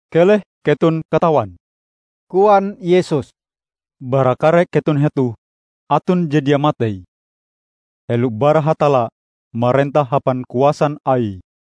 "Keleh keton katawan!" koan Yesus. "Bara kare keton hetoh aton je dia matei, helo bara Hatalla marentah hapan kuasan Aie!"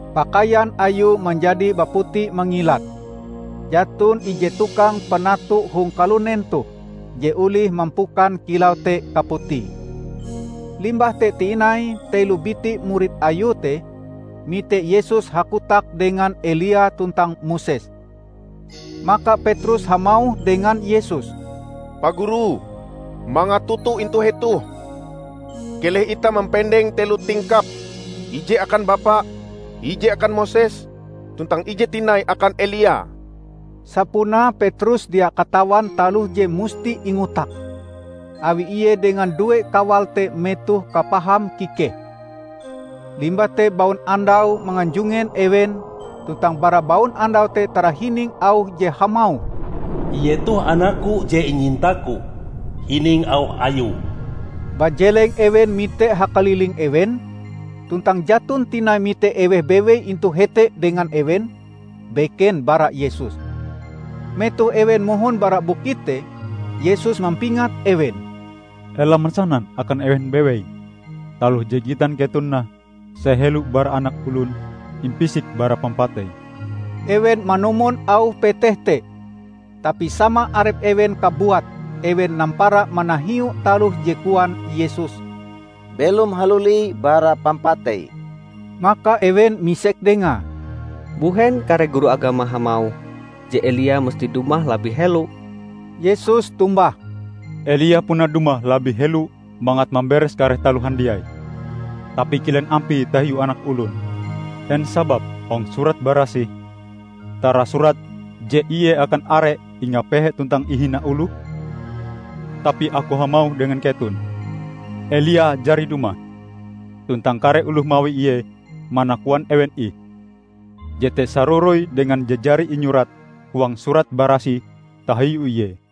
Pakaian Ayue manjadi baputi mangilat. Jaton ije tukang penatu hong kalunen toh je olih mampukan kilau te kaputie. Limbah te tinai telo biti murid Ayue te mite Yesus hakotak dengan Elia tuntang Moses. Maka Petrus hamauh dengan Yesus, "Pa Guru, mangat toto intu hetoh. Keleh itah mampendeng telo tingkap: ije akan Bapa, ije akan Moses, tuntang ije tinai akan Elia." Sapunae Petrus dia katawan taloh je musti ingotake, awi ie dengan due kawale te metoh kapaham kikehe. Limbah te baunandau manganjungen ewen tuntang bara baunandau te tarahining auh je hamauh, "Ie toh Anakku je inyintaku. Hining auh Ayue!" Bajeleng ewen mite hakaliling ewen, tuntang jaton tinai mite eweh bewei intu hete dengan ewen, beken bara Yesus. Metoh ewen mohon bara bukit te, Yesus mampingat ewen, "Ela mansanan akan eweh bewei taloh je gitan keton nah sahelo bara Anak Olon impisik bara pampatei." Ewen manumon auh peteh te, tapi sama arep ewen kabuat ewen nampara manahiu taloh je koan Yesus "belom haluli bara pampatei". Maka ewen misek Dengae, "Mbuhen kare guru agama hamauh, je Elia musti dumah labih helo?" Yesus tombah, "Elia puna dumah labih helo mangat mamberes kare taloh handiai. Tapi kilen ampie tahiu Anak Olon? En sababe hong Surat Barasih tarasurat je Ie akan are ingapehe tuntang ihina oloh? Tapi Aku hamauh dengan keton: Elia jari dumah, tuntang kare oloh mawi ie mana koan ewen ih. Jete saroroi dengan je jari inyurat huang Surat Barasih tahiu ie."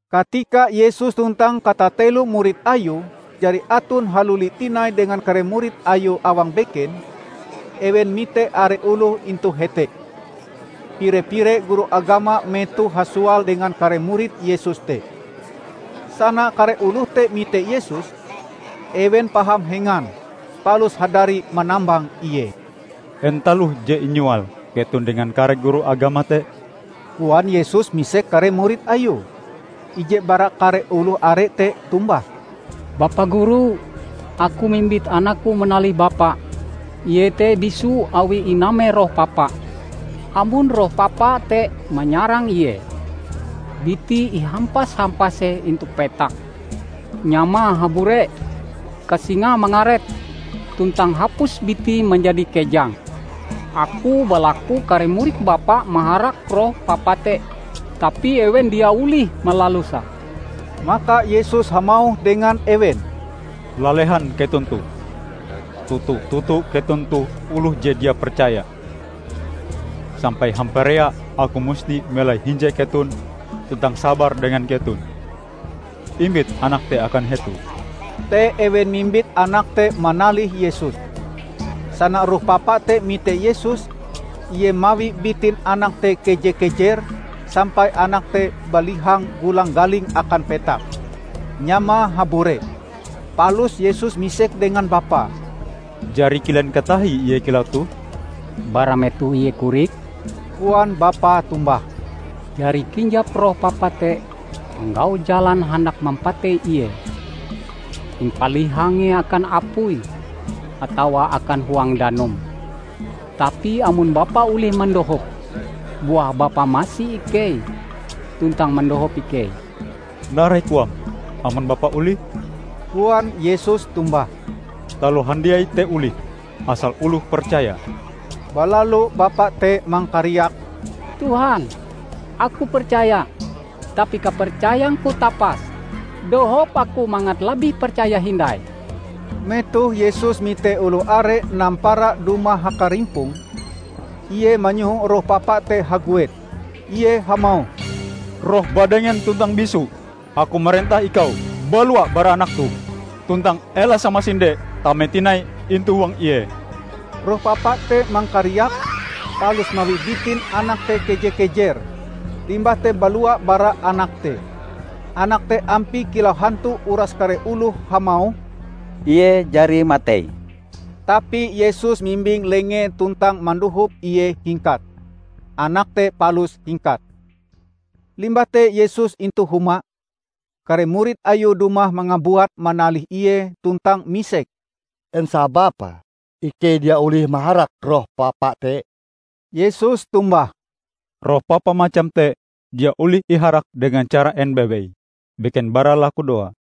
Katika Yesus tuntang katatelo murid Ayue jari aton haluli tinai dengan kare murid Ayue awang beken, ewen mite are oloh intu hete. Pire-pire guru agama metohe hasoal dengan kare murid Yesus te. Sana kare oloh te mite Yesus, ewen paham hengan, palus hadari manambang Ie. "En taloh je inyoal keton dengan kare guru agama te?" koan Yesus misek kare murid Ayue. Ije bara kare oloh are te tombah, "Bapa Guru, aku mimbit anakku manalih Bapa. Ie te bisu awi iname roh papa. Amon roh papa te manyarang ie, bitie ihampas-hampase intu petak, nyamae habure, kasingae mangaret tuntang hapus bitie manjadi kejang. Aku balaku kare murid Bapa maharak roh papa te, tapi ewen dia olih malaluse." Maka Yesus hamauh dengan ewen, "Lalehan keton toh! Toto-toto keton toh oloh je dia percaya. Sampai hamparea aku musti melai hinje keton tuntang sabar dengan keton? Imbit anak te akan hetoh!" Te ewen mimbit anak te manalih Yesus. Sana roh papa te mite Yesus, ie mawi bitin anak te keje-kejer sampai anak te balihang gulang-galing akan petak. Nyamae habure. Palus Yesus misek dengan bapae, "Jari kilen katahie ie kilau toh?" "Bara metoh ie korik!" koan bapae tombah. "Jari kinjap roh papa te manggau jalan handak mampatei ie, impalihange akan apui atawa akan huang danum. Tapi amon Bapa olih mandohop, buah Bapa masi ikei tuntang mandohop ikei!" "Narai koam? Amon Bapa olih?" koan Yesus tombah. "Taloh handiai te olih, asal oloh percaya!" Balalu bapa te mangkariak, "Tuhan, aku percaya tapi kapercayangku tapas. Dohop aku mangat labih percaya hindai!" Metoh Yesus mite oloh are nampara dumah hakarimpong, Ie manyoho roh papa te haguet. Ie hamauh, "Roh badengen tuntang bisu aku marentah ikau balua bara anak toh tuntang ela samasinde tame tinai intu huang ie!" Roh papa te mangkariak, palus mawi bitin anak te keje-kejer, limbah te balua bara anak te. Anak te ampie kilau hantu uras kare oloh hamauh, "Ie jari matei!" Tapi Yesus mimbing lengee tuntang mandohop ie hingkat. Anak te palus hingkat. Limbah te Yesus intu huma, kare murid Ayue dumah mangabuat manalih Ie tuntang misek, "En sababe ikei dia olih maharak roh papa te?" Yesus tombah, "Roh papa macam te dia olih iharak dengan cara en bewei, beken bara lakudoa."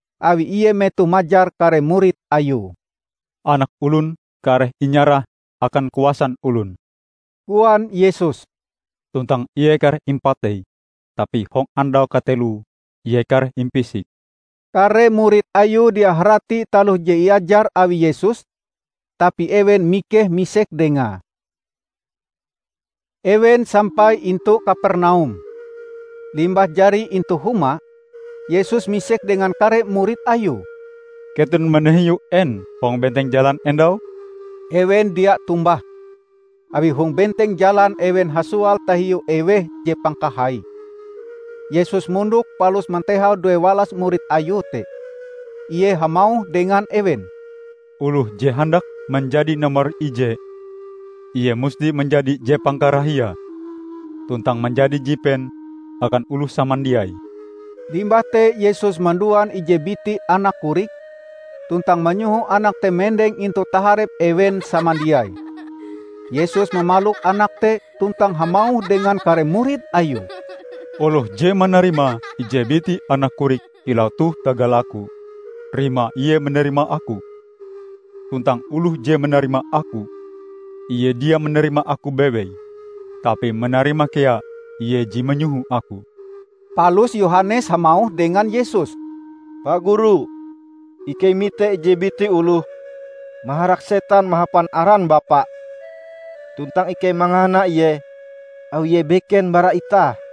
awi Ie metoh majar kare murid Ayue. "Anak Olon kareh inyarah akan kuasan olon," koan Yesus, "tuntang Ie kareh impatei tapi hong andau kateloe Ie kareh impisik!" Kare murid Ayue dia harati taloh je iajar awi Yesus, tapi ewen mikeh misek Dengae. Ewen sampai intu Kapernaum. Limbah jari intu huma, Yesus misek dengan kare murid Ayue, "Keton manahiu en hong benteng jalan endau?" Ewen dia tombah awi hong benteng jalan ewen hasoal tahiu eweh je pangkahaie. Yesus mondok palus mantehau duewalas murid Ayue te. Ie hamauh dengan ewen, "Oloh je handak manjadi nomor ijee, ie musti manjadi je pangkarahiae tuntang manjadi jipen akan oloh samandiai." Limbah te Yesus manduan ije biti anak korik, tuntang manyoho anak te mendeng intu taharep ewen samandiai. Yesus mamalok anak te tuntang hamauh dengan kare murid Ayue, "Oloh je manarima ije biti anak korik kilau toh tagal Aku, rimae ie manarima Aku. Tuntang oloh je manarima Aku, ie dia manarima Aku bewei, tapi manarima kea Ie je manyoho Aku." Palus Yohanes hamauh dengan Yesus, "Pa Guru, ikei mite ije biti oloh maharak setan mahapan aran Bapa. Tuntang ikei mangahana ie awi ie beken bara itah."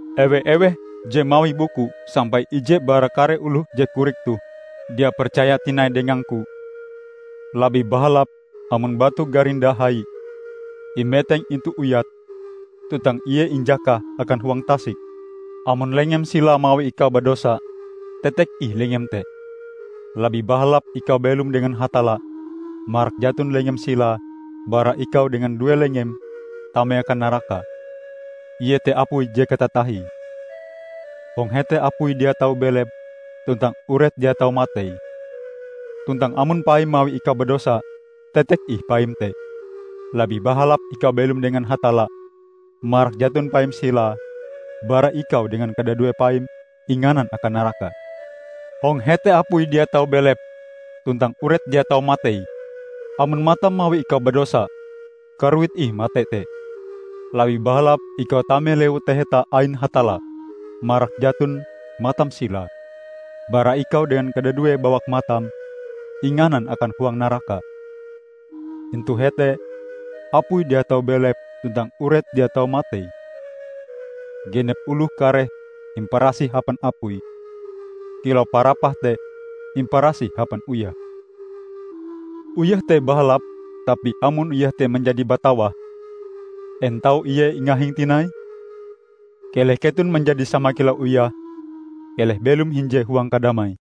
"Ewe-eweh je mawi buku sampai ije bara kare oloh je korik toh dia percaya tinai dengang-Ku, labih bahalap amon batu garinda hai imeteng intu uyate, tuntang ie injakah akan huang tasik. Amon lengem silae mawi ikau badosa, tetek ih lengem te! Labih bahalap ikau belom dengan Hatalla marak jaton lengem silae bara ikau dengan due lengem tame akan naraka, iete apui je katatahie. [ Hong hete apui dia tau belep, tuntang uret dia tau matei.] Tuntang amon paim mawi ikau badosa, tetek ih paim te. Labih bahalap ikau belom dengan Hatalla marak jaton paim silae bara ikau dengan kadadue paim inganan akan naraka. [ Hong hete apui dia tau belep tuntang uret dia tau matei.] Amon matam mawi ikau badosa, karuit ih mate te! Labih bahalap ikau tame Lewu Taheta ain Hatalla marak jaton matam silae, bara ikau dengan kadadue bawak matam inganan akan huang naraka. Intu hete apui dia tau belep tuntang uret dia tau matei. Genep oloh kareh imparasih hapan apui, kilau parapah te imparasih hapan uyah. Uyah te bahalap tapi amon uyah te manjadi batawah, en tau ie ingahing tinai? Keleh keton manjadi sama kilau uyah -- keleh belom hinje huang kadamai."